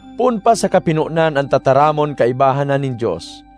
Poon pa sa kapinonan, an Tataramon kaibahan na nin Dios.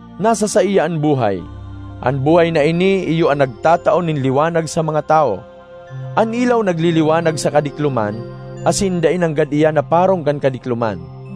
Nasa saiya an buhay; an buhay na ini iyo an nagtatao nin liwanag sa mga tawo. An ilaw nagliliwanag sa kadikloman, asin dai nanggad iyan naparong kan kadikloman.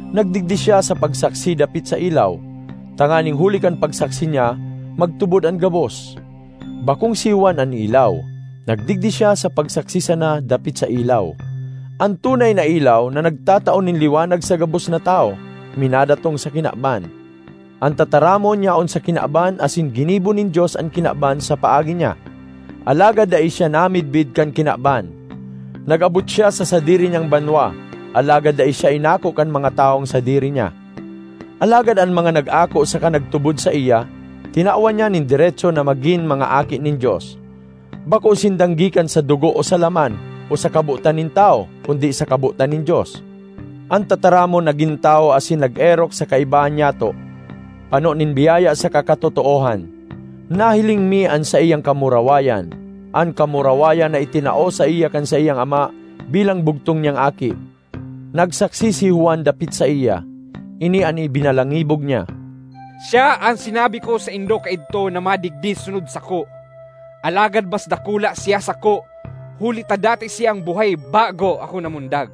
Nagdigdi siya sa pagsaksi dapit sa ilaw, tanganing huli kan pagsaksi niya magtubod an gabos. Bakong si Juan an ilaw; nagdigdi siya sa pagsaksi sana dapit sa ilaw. An tunay na ilaw, na nagtatao nin liwanag sa gabos na tawo, minadatong sa kinaban. An Tataramon yaon sa kinaban asin ginibo nin Dios an kinaban sa paagi niya, alagad dai siya namidbid kan kinaban. Nag-abot siya sa sadiri niyang banwa, alagad dai siya inako kan mga tawong sadiri niya. Alagad an mga nag-ako saka nagtubod saiya, tinawan niya nin deretso na magin mga aki nin Dios. Bako sindang gikan sa dugo o sa laman o sa kabotan nin tawo, kundi sa kabotan nin Dios. An Tataramon nagin tawo asin nag-erok sa kaibahan nyato, pano nin biyaya saka katotoohan. Nahiling mi an saiyang kamurawayan, an kamurawayan na itinao saiya kan saiyang Ama bilang bugtong niyang Aki. Nagsaksi si Juan dapit saiya. Ini an ibinalangibog niya, “Siya an sinabi ko saindo kaidto na madigdi sunod sako, alagad mas dakula siya sako huli ta dati siyang buhay bago ako namundag.”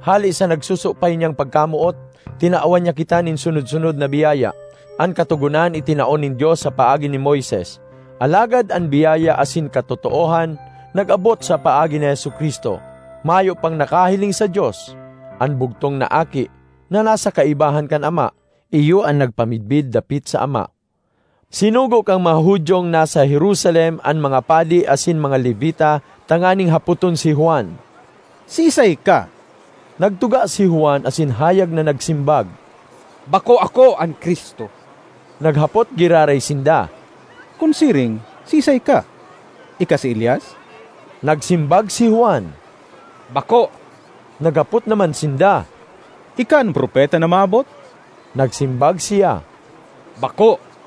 Hale sa nagsusupay niyang pagkamoot, tinawan niya kita nin sunod-sunod na biyaya. An Katogonan itinao nin Dios sa paagi ni Moises, alagad an biyaya asin katotoohan nag-abot sa paagi ni Jesu-Cristo. Mayo pang nakahiling sa Dios; an bugtong na Aki, na nasa kaibahan kan Ama, iyo an nagpamidbid dapit sa Ama. Sinugo kan mga Judiong nasa Jerusalem an mga padi asin mga Levita tanganing hapoton si Juan, “Siisay ka?” Nagtuga si Juan asin hayag na nagsimbag, “Bako ako an Cristo.” Naghapot giraray sinda, “Kun siring, siisay ka? Ika si Elias?” Nagsimbag si Juan, “Bako.” Naghapot naman sinda, “Ika an Propeta na maabot?” Nagsimbag siya, “Bako.”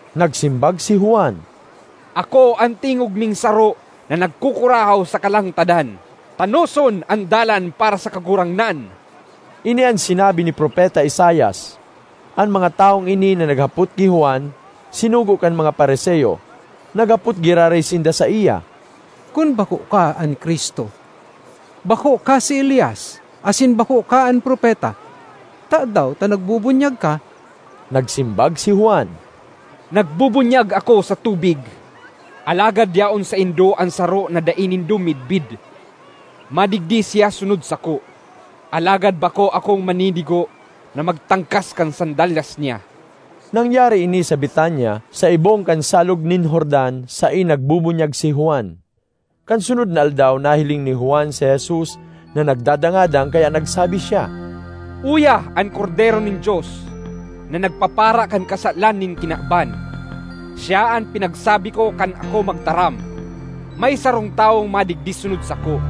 Nagsimbag si Juan, “Ako ‘An tingog nin saro na nagkukurahaw sa kalangtadan: Tanoson an dalan para sa Kagurangnan!’” (Ini an sinabi ni Propeta Isaias.) An mga tawong ini na naghapot ki Juan sinugo kan mga Fariseo. Naghapot giraray sinda saiya, “Kun bako ka an Cristo, bako ka si Elias asin bako ka an Propeta, tadaw ta nagbubunyag ka?” Nagsimbag si Juan, “Nagbubunyag ako sa tubig; alagad yaon saindo an saro na dai nindo midbid. Madigdi siya sunod sako, alagad bako akong maninigo na magtangkas kan sandalyas niya.” Nangyari ini sa Betania, sa ibong kan Salog nin Jordan saen nagbubunyag si Juan. Kan sunod na aldaw nahiling ni Juan si Jesus na nagdadangadang, kaya nagsabi siya, “Uya an Kordero nin Dios, na nagpapara kan kasalan nin kinaban! Siya an pinagsabi ko kan ako magtaram, ‘May sarong tawong madigdi sunod sako,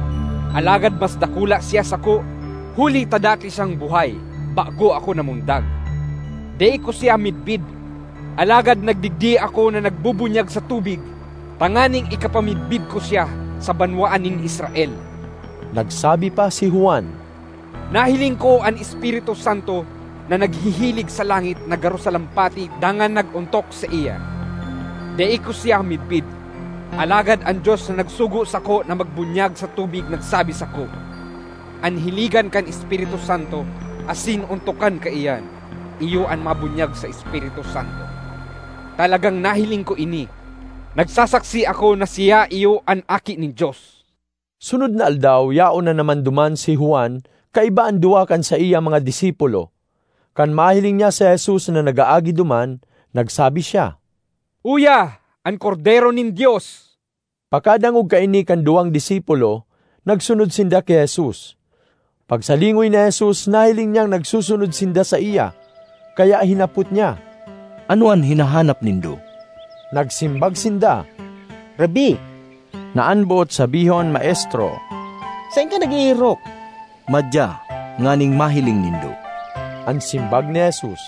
alagad mas dakula siya sako huli ta dati siyang buhay bago ako namundag.’ Dai ko siya midbid, alagad nagdigdi ako na nagbubunyag sa tubig tanganing ikapamidbid ko siya sa banwaan nin Israel.” Nagsabi pa si Juan, “Nahiling ko an Espiritu Santo na naghihilig sa langit na garo salampati dangan nag-ontok saiya. Dai ko siya midbid, alagad an Dios na nagsugo sako na magbunyag sa tubig nagsabi sako, ‘An hiligan kan Espiritu Santo asin ontokan kaiyan, iyo an mabunyag sa Espiritu Santo.’ Talagang nahiling ko ini; nagsasaksi ako na siya iyo an Aki nin Dios.” Sunod na aldaw yaon na naman duman si Juan kaiba an duwa kan saiyang mga disipulo. Kan mahiling niya si Jesus na nag-aagi duman, nagsabi siya, “Uya an Kordero nin Dios!” Pakadangog kaini kan duwang disipulo, nagsunod sinda ki Jesus. Pagsalingoy ni Jesus, nahiling niyang nagsusunod sinda saiya, kaya hinapot niya, “Ano an hinahanap nindo?” Nagsimbag sinda, “Rabbi (na an boot sabihon Maestro), saen ka nag-eerok?” ”Madya, nganing mahiling nindo,” an simbag ni Jesus.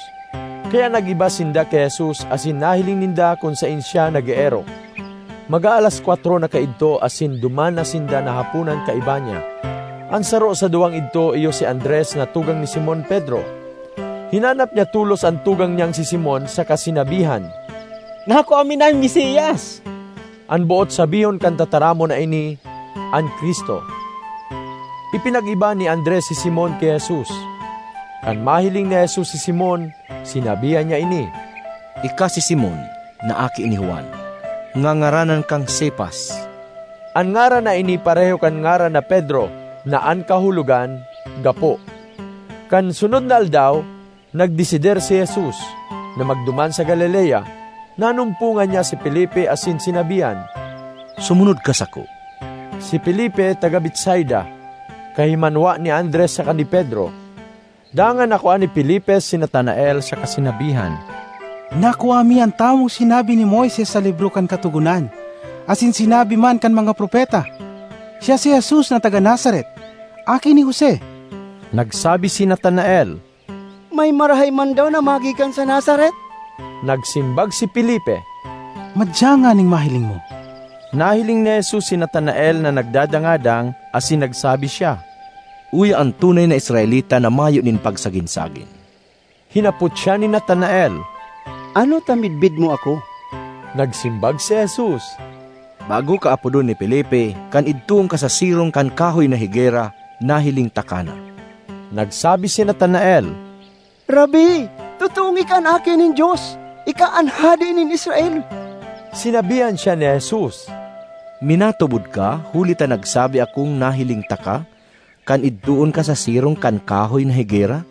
Kaya nag-iba sinda ki Jesus, asin nahiling ninda kun saen siya nag-eerok. Mag-aalas kwatro na kaidto asin duman na sinda nahaponan kaiba niya. An saro sa duwang idto iyo si Andres na tugang ni Simon Pedro. Hinanap niya tolos an tugang niyang si Simon saka sinabihan, “Nakua mi na an Mesias!” (An boot sabihon kan tataramon na ini “An Cristo.”) Ipinag-iba ni Andres si Simon ki Jesus. Kan mahiling ni Jesus si Simon, sinabihan niya ini, “Ika si Simon na aki ni Juan. Ngangaranan kang Cefas.” (An ngaran na ini pareho kan ngaran na Pedro na an kahulogan, “gapo.”) Kan sunod na aldaw, nagdesidir si Jesus, na magduman sa Galilea. Nanumpongan niya si Felipe asin sinabihan, “Sumunod ka sako!” (Si Felipe taga Betsaida, kahimanwa ni Andres saka ni Pedro.) Dangan nakua ni Felipe si Natanael saka sinabihan, “Nakua mi an tawong sinabi ni Moises sa libro kan Katogonan asin sinabi man kan mga propeta. Siya si Jesus na taga Nazaret, aki ni Jose.” Nagsabi si Natanael, “May marahay man daw na magikan sa Nazaret?” Nagsimbag si Felipe, “Madya nganing mahiling mo.” Nahiling ni Jesus si Natanael na nagdadangadang, asin nagsabi siya, “Uya an tunay na Israelita na mayo nin pagsagin-sagin!” Hinapot siya ni Natanael, “Ano ta midbid mo ako?” Nagsimbag si Jesus, “Bago ka apodon ni Felipe, kan idtoon ka sa sirong kan kahoy na higera, nahiling taka na.” Nagsabi si Natanael, “Rabbi, totoong ika an Aki nin Dios! Ika an Hade nin Israel!” Sinabihan siya ni Jesus, “Minatubod ka huli ta nagsabi akong nahiling taka kan idtoon ka sa sirong kan kahoy na higera?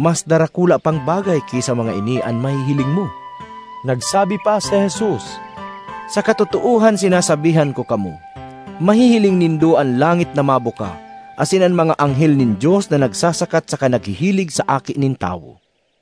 Mas darakula pang bagay ki sa mga ini an mahihiling mo!” Nagsabi pa si Jesus, “Sa katotoohan sinasabihan ko kamo, mahihiling nindo an langit na mabuka, asin an mga anghel nin Dios na nagsasakat saka naghihilig sa Aki nin Tawo!”